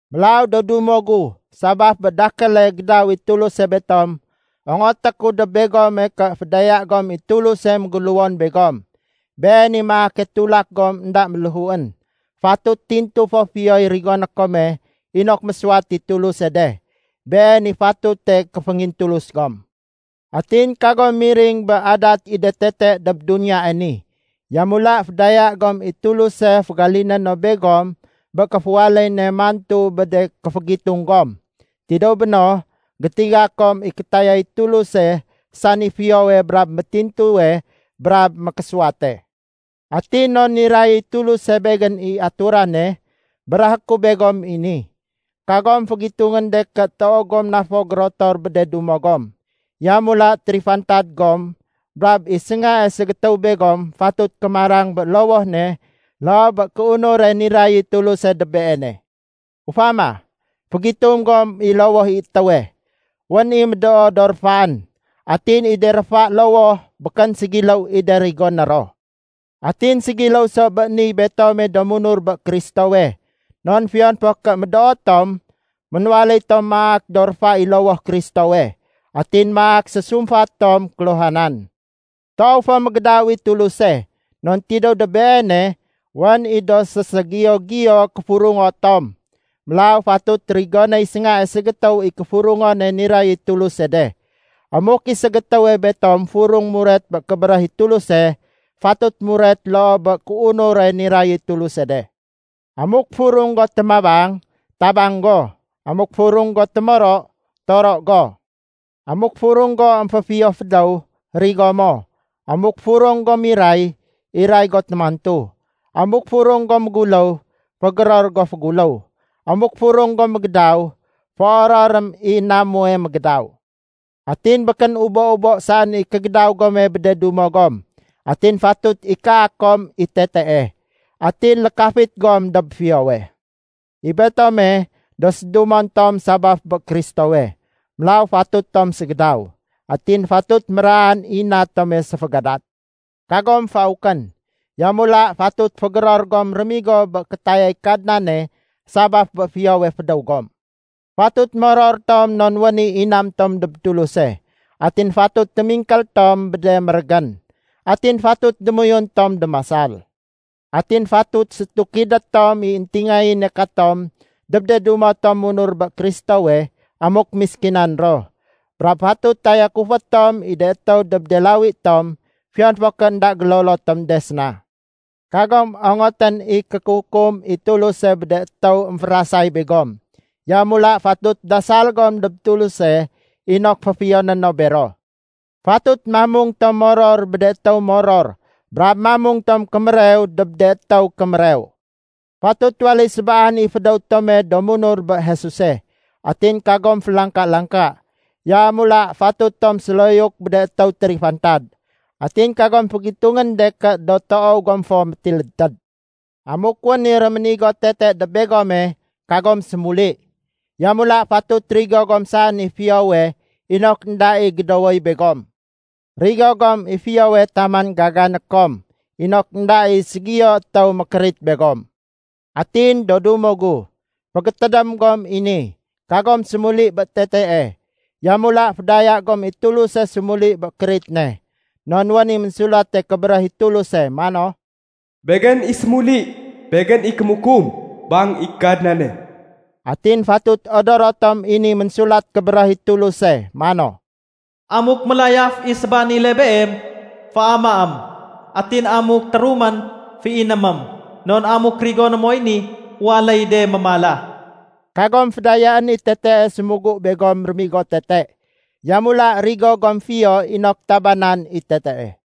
Mélaw do dumo gu, sabaf bé dakéle gédaw i Tuluse betom, ongoté ku dob begome ké fédaya gom i Tuluse méguléwon begom. Been i maake tulak gom énda méléhuén. Fatut tintu fo fiyoy rigoné kome inok mésuwat i Tuluse de. Been i fatute kéféngintulus gom. Atin kagom miring bé adat i de tete dob duniyae ni. Yamula fédaya gom i Tuluse fégaliné no begom bé kéféwaléy ne mantu bé de kéfégitung gom. Tidéw béno, gétiga kom i kétayay Tuluse sani fiyowe brab métintuwe brab mékésuwate. Atin non niray i Tuluse begén i aturane, béréhé ku begom i ni: Kagom fégitungén de ké toow gom na fo gérotor bé de dumo gom. Yamula térifantad gom brab i séngae ségétéw begom fatut kémarang bé lowoh ne loo bé kéunure niray i Tuluse dob beene. Ufama, fégitung gom i lowoh i étéwe. Wén i médoo do réfaén. Atin i de réfa lowoh békén ségiléw i de rigoné ro. Atin ségiléw so bé niy betome do munur bé Kristowe. Non fiyon fo ké médoo tom, ménwaléy tom maak do réfa i lowoh Kristowe. Atin maak sésumfat tom kéluhanan. Toow fo mégédaw i Tuluse. Non tidéw dob Beene wén i do séségiyo-giyo kéfurungo tom. Mélaw fatut rigonéy séngae ségétéw i kéfurungone niray i Tuluse de. Amuk i ségétéwe betom furung muret bé kébéréh i Tuluse, fatut muret loo bé kéunure niray i Tuluse de. Amuk furung go témabang, tabang go. Amuk furung go témoro, toro go. Amuk furung go émféfiyo fédéw, rigo mo. Amuk furung go miray, iray go témantu. Amuk furung go méguléw, fégéror go féguléw. Amuk furung go mégédaw, féororém i na muwe mégédaw. Atin békén ubo-ubo saén i kégédaw gome bé de dumo gom. Atin fatut ikaa kom i tetee. Atin lékafit gom dob fiyowe. I betome, do sédumon tom sabaf bé Kristowe, mélaw fatut tom ségédaw. Atin fatut méraan i na tome séfégadat. Kagom faukén, yamula fatut fégéror gom rémigo bé kétayay Kadnane sabaf bé fiyowe fédéw gom. Fatut moror tom non wén i inam tom dob Tuluse. Atin fatut témingkél tom bé de mérégén. Atin fatut démoyun tom démasal. Atin fatut sétukidé tom i éntingayéne katom dob de dumo tom munur bé Kristowe amuk méskinan ro. Brab fatut tayakufé tom i de étéw dob de lawi tom fiyon fo ké énda gélolo tom de séna. Kagom ongotén i kékukum i Tuluse bé de étéw émférasay begom. Yamula fatut dasal gom dob Tuluse inok féfiyoné no bero. Fatut mamung tom moror bé de étéw moror brab mamung tom kémérew dob de étéw kémérew. Fatut waléy sébaan i fédéw tome do munur bé Jesuse. Atin kagom félangka-langka, yamula fatut tom séloyuk bé de étéw térifantad. Atin kagom fégitungén de ké do toow gom fo métilédtéd. Amuk wén i réménigo tete dob begome, kagom sémuli. Yamula fatut rigo gom saén i fiyowe inok énda i gédowoy begom. Rigo gom i fiyowe taman gagané kom inok énda i ségiyo étéw mékérit begom. Atin do dumo gu, fégétédém gom i ni, kagom sémuli bé tetee. Yamula fédaya gom i Tuluse sémuli bé kérit ne. Non wén i Ménsulate Kébéréh i Tuluse mano, “Begén i sémuli. Begén i kémukum, bang i Kadnane.” Atin fatut odoro tom i ni Ménsulat Kébéréh i Tuluse mano, “Amuk mélayaf i sébanile beem, féamaém. Atin amuk térumén, féinémém. Non amuk rigoné moy ni, waléy de mémala.” Kagom fédayaén i tetee sémugu begom rémigo tete. Yamula rigo gom fiyo inok tabanan i tetee.